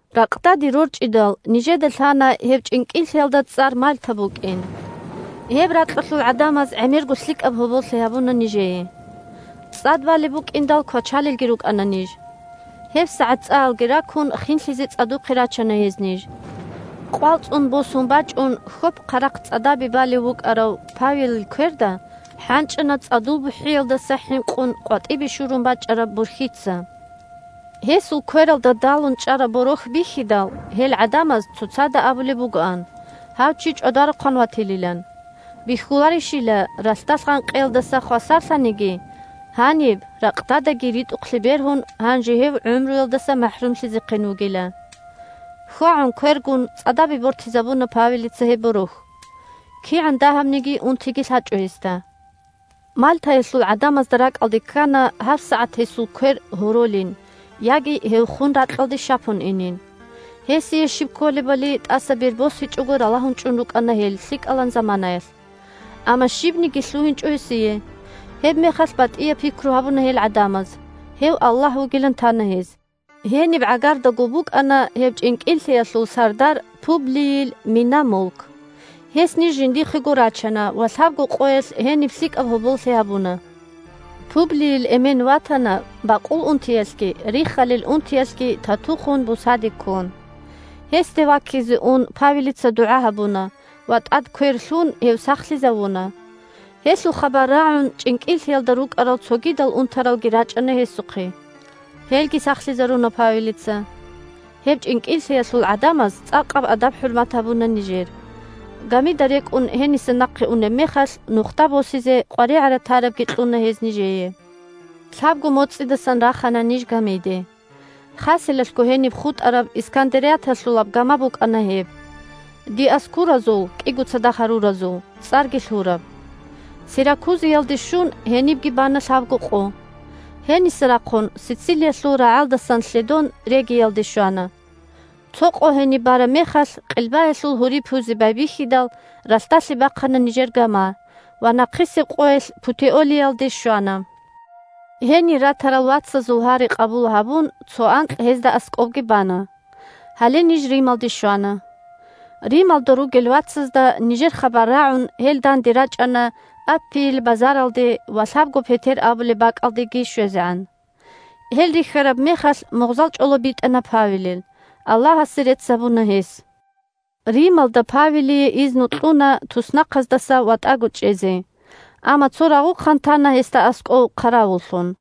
Ракъдаде рорчӀидал, нижеда лъана гьеб чӀинкӀиллъиялда цӀар Мальта букӀин. Гьеб ракьалъул гӀадамаз гӀемерго лъикӀаб гьоболлъи гьабуна нижее. ЦӀад балеб букӀиндал, квачалелги рукӀана ниж. ГьебсагӀат цӀаялги ракун, хинлъизе цӀадухъе рачана гьез ниж. Къвал цӀун босун бачӀун, хьоп-хъарахъ цӀадабе балев вукӀарав Павелил кверда хӀанчӀана цӀадул бухӀиялдаса хӀинкъун къватӀибе шурун бачӀараб борхьица. Гьесул квералда далун чӀараб борохь бихьидал, гьел гӀадамаз цоцазда абулеб бугоан гьав чи чӀвадарухъан ватилилан. Бихьуларищила, ралъдалъ гъанкъиялдаса хвасарлъаниги, гьаниб ракъдадаги ритӀухълъи бергьун, гьанже гьев гӀумруялдаса махӀрумлъизехъин вугила. ХьвагӀун квергун, цӀадабе бортизабуна Павелица гьеб борохь. КигӀан дагьабниги унтиги лъачӀо гьесда. Мальтаялъул гӀадамазда ракӀалде ккана гьабсагӀат гьесул квер гьоролин яги гьев хун ракьалде щапун инин. Гьесие щиб кколебали тӀаса бер босичӀого ралагьун чӀун рукӀана гьел лъикӀалан заманаялъ. Амма щибниги лъугьинчӀо гьесие. Гьебмехалъ батӀияб пикру гьабуна гьел гӀадамаз: гьев аллагь вугилан тана гьез. Гьениб гӀагардаго букӀана гьеб чӀинкӀиллъиялъул сардар Публийил мина-мулк. Гьес ниж жиндихъего рачана ва лъабго къоялъ гьениб лъикӀаб гьоболлъи гьабуна. Публийил эмен ватана, бакъул унтиялъги риххалил унтиялъги тату хун, бусаде ккун. Гьесде ваккизе ун, Павелица дугӀа гьабуна ва тӀад квер лъун гьев сахлъизавуна. Гьелъул хабар рагӀун, чӀинкӀиллъиялда рукӀарал цогидал унтаралги рачӀана гьесухъе. Гьелги сахлъизаруна Павелица. Гьеб чӀинкӀиллъиялъул гӀадамаз цӀакъаб адаб-хӀурмат гьабуна нижер. Гамида рекӀун гьениса нахъе унеб мехалъ нухда босизе къваригӀара-тарабги кьуна гьез нижее. Лъабго моцӀидасан рахана ниж гамиде. Хаселалъго гьениб хутӀараб Искандарияталъулаб гама букӀана гьеб, Диоскуразул – «КӀиго цадахъ гьаруразул» цӀарги лъураб. Сиракузиялде щун, гьенибги бана лъабго къо. Гьениса рахъун, Сицилиялъул рагӀалдасан лъедон, Региялде щвана. Цо къо гьениб бараб мехалъ, къилбаялъул гьури пуйзе байбихьидал, ралъдалъе бахъана нижер гама ва нахъисеб къоялъ Путеолиялде щвана. Гьенир ратарал вацазул гьари къабул гьабун цо анкь гьезда аскӀобги бана. Гьале ниж Рималде щвана. Рималда ругел вацазда нижер хабар рагӀун, гьел данде рачӀана Аппийил Базаралде ва «Лъабго Петер» абулеб бакӀалдеги щвезегӀан. Гьел рихьараб мехалъ мугъзал чӀоло битӀана Павелил, Аллагьасе рецц гьабуна гьес. Рималда Павелие изну кьуна туснахъаздаса ватӀаго чӀезе, амма цо рагъухъан тана гьесда аскӀов хъаравуллъун.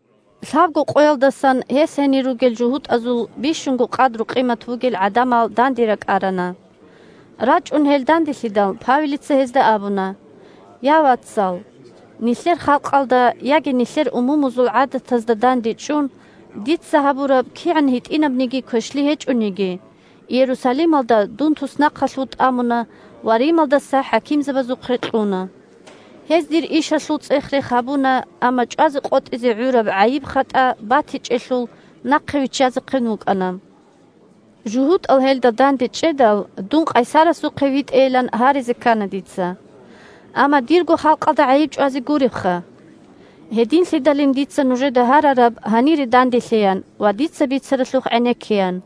Лъабго къоялдасан гьес гьенир ругел жугьутӀазул бищунго къадру-къимат бугел гӀадамал данде ракӀарана. РачӀун гьел данделъидал, Павелица гьезда абуна: – Я, вацал! Нилъер халкъалда яги нилъер умумузул гӀадатазда дандечӀун дица гьабураб кигӀан гьитӀинабниги квешлъи гьечӀониги, Иерусалималда дун туснахъалъув тӀамуна ва Рималдаса хӀакимзабазухъе кьуна. Гьез дир ишалъул цӀех-рех гьабуна, амма чӀвазе къотӀизе гӀураб гӀайиб-хатӀа батичӀелъул, нахъе виччазехъин вукӀана. ЖугьутӀал гьелда дандечӀедал, дун къайсарасухъе витӀейилан гьаризе ккана дица. Амма дирго халкъалда гӀайиб чӀвазе гуребха! Гьединлъидалин дица нужеда гьарараб гьанире данделъеян ва дица бицаралъухъ гӀенеккеян.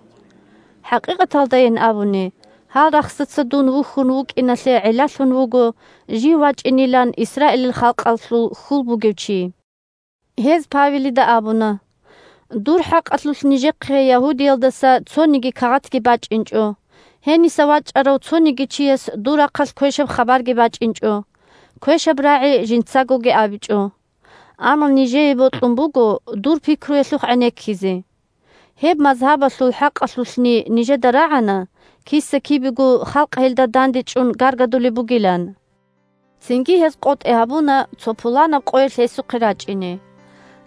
ХӀакъикъаталдайин абуни, гьал рахсаца дун вухьун вукӀиналъе гӀиллалъун вуго Жив вачӀинилан Исраилил халкъалъул хьул бугев чи. Гьез Павелида абуна: – Дур хӀакъалъулъ нижехъе Ягьудиялдаса цониги кагъатги бачӀинчӀо, гьениса вачӀарав цониги чияс дур рахъалъ квешаб хабарги бачӀинчӀо, квешаб рагӀи жинцагоги абичӀо. Амма нижее бокьун буго дур пикруялъухъ гӀенеккизе. Гьеб мазгьабалъул хӀакъалъулъни нижеда рагӀана, киса-кибего халкъ гьелда дандечӀун гаргадулеб бугилан. Цинги гьез къотӀи гьабуна цо пуланаб къоялъ гьесухъе рачӀине.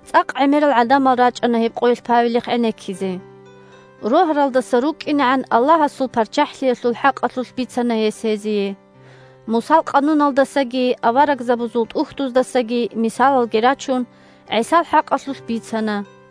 ЦӀакъ гӀемерал гӀадамал рачӀана гьеб къоялъ Павелихъ гӀенеккизе. Рогьаралдаса рукӀкӀинегӀан Аллагьасул ПарччахӀлъиялъул хӀакъалъулъ бицана гьес гьезие. Мусал къануналдасаги Аварагзабазул ТӀухьдуздасаги мисалалги рачун, ГӀисал хӀакъалъулъ бицана.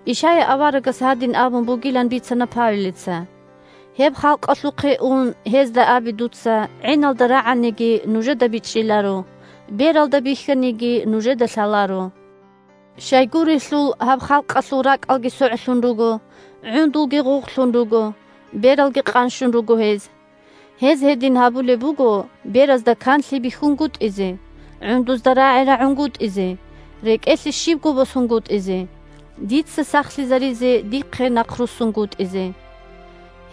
Ишая аварагас гьадин абун бугилан бицана Павелица: – «Гьеб халкъалъухъе ун, гьезда абе дуца: гӀиналда рагӀаниги, нужеда бичӀчӀиларо, бералда бихьаниги, нужеда лъаларо. Щайгурелъул гьаб халкъалъул ракӀалги согӀлъун руго, гӀундулги гъугълъун руго, бералги къанщун руго гьез. Гьез гьедин гьабулеб буго беразда канлъи бихьунгутӀизе, гӀундузда рагӀи рагӀунгутӀизе, рекӀелъе щибго босунгутӀизе, дица сахлъизаризе дихъе нахъруссунгутӀизе».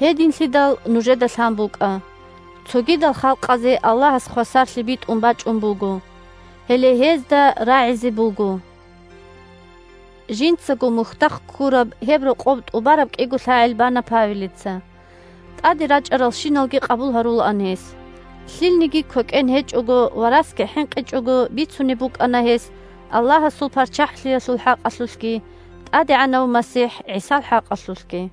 Гьединлъидал нужеда лъан букӀа: цогидал халкъазе Аллагьас хвасарлъи битӀун бачӀун буго. Гьеле гьезда рагӀизе буго! Жинцаго мухьдахъ ккураб гьеб рокъоб тӀубараб кӀиго лъагӀел бана Павелица. ТӀаде рачӀаралщиналги къабул гьарулаан гьес. Лъилниги квекӀен гьечӀого ва расги хӀинкъичӀого бицунеб букӀана гьес Аллагьасул ПарччахӀлъиялъул хӀакъалъулъги ТӀадегӀанав МасихӀ ГӀисал хӀакъалъулъги.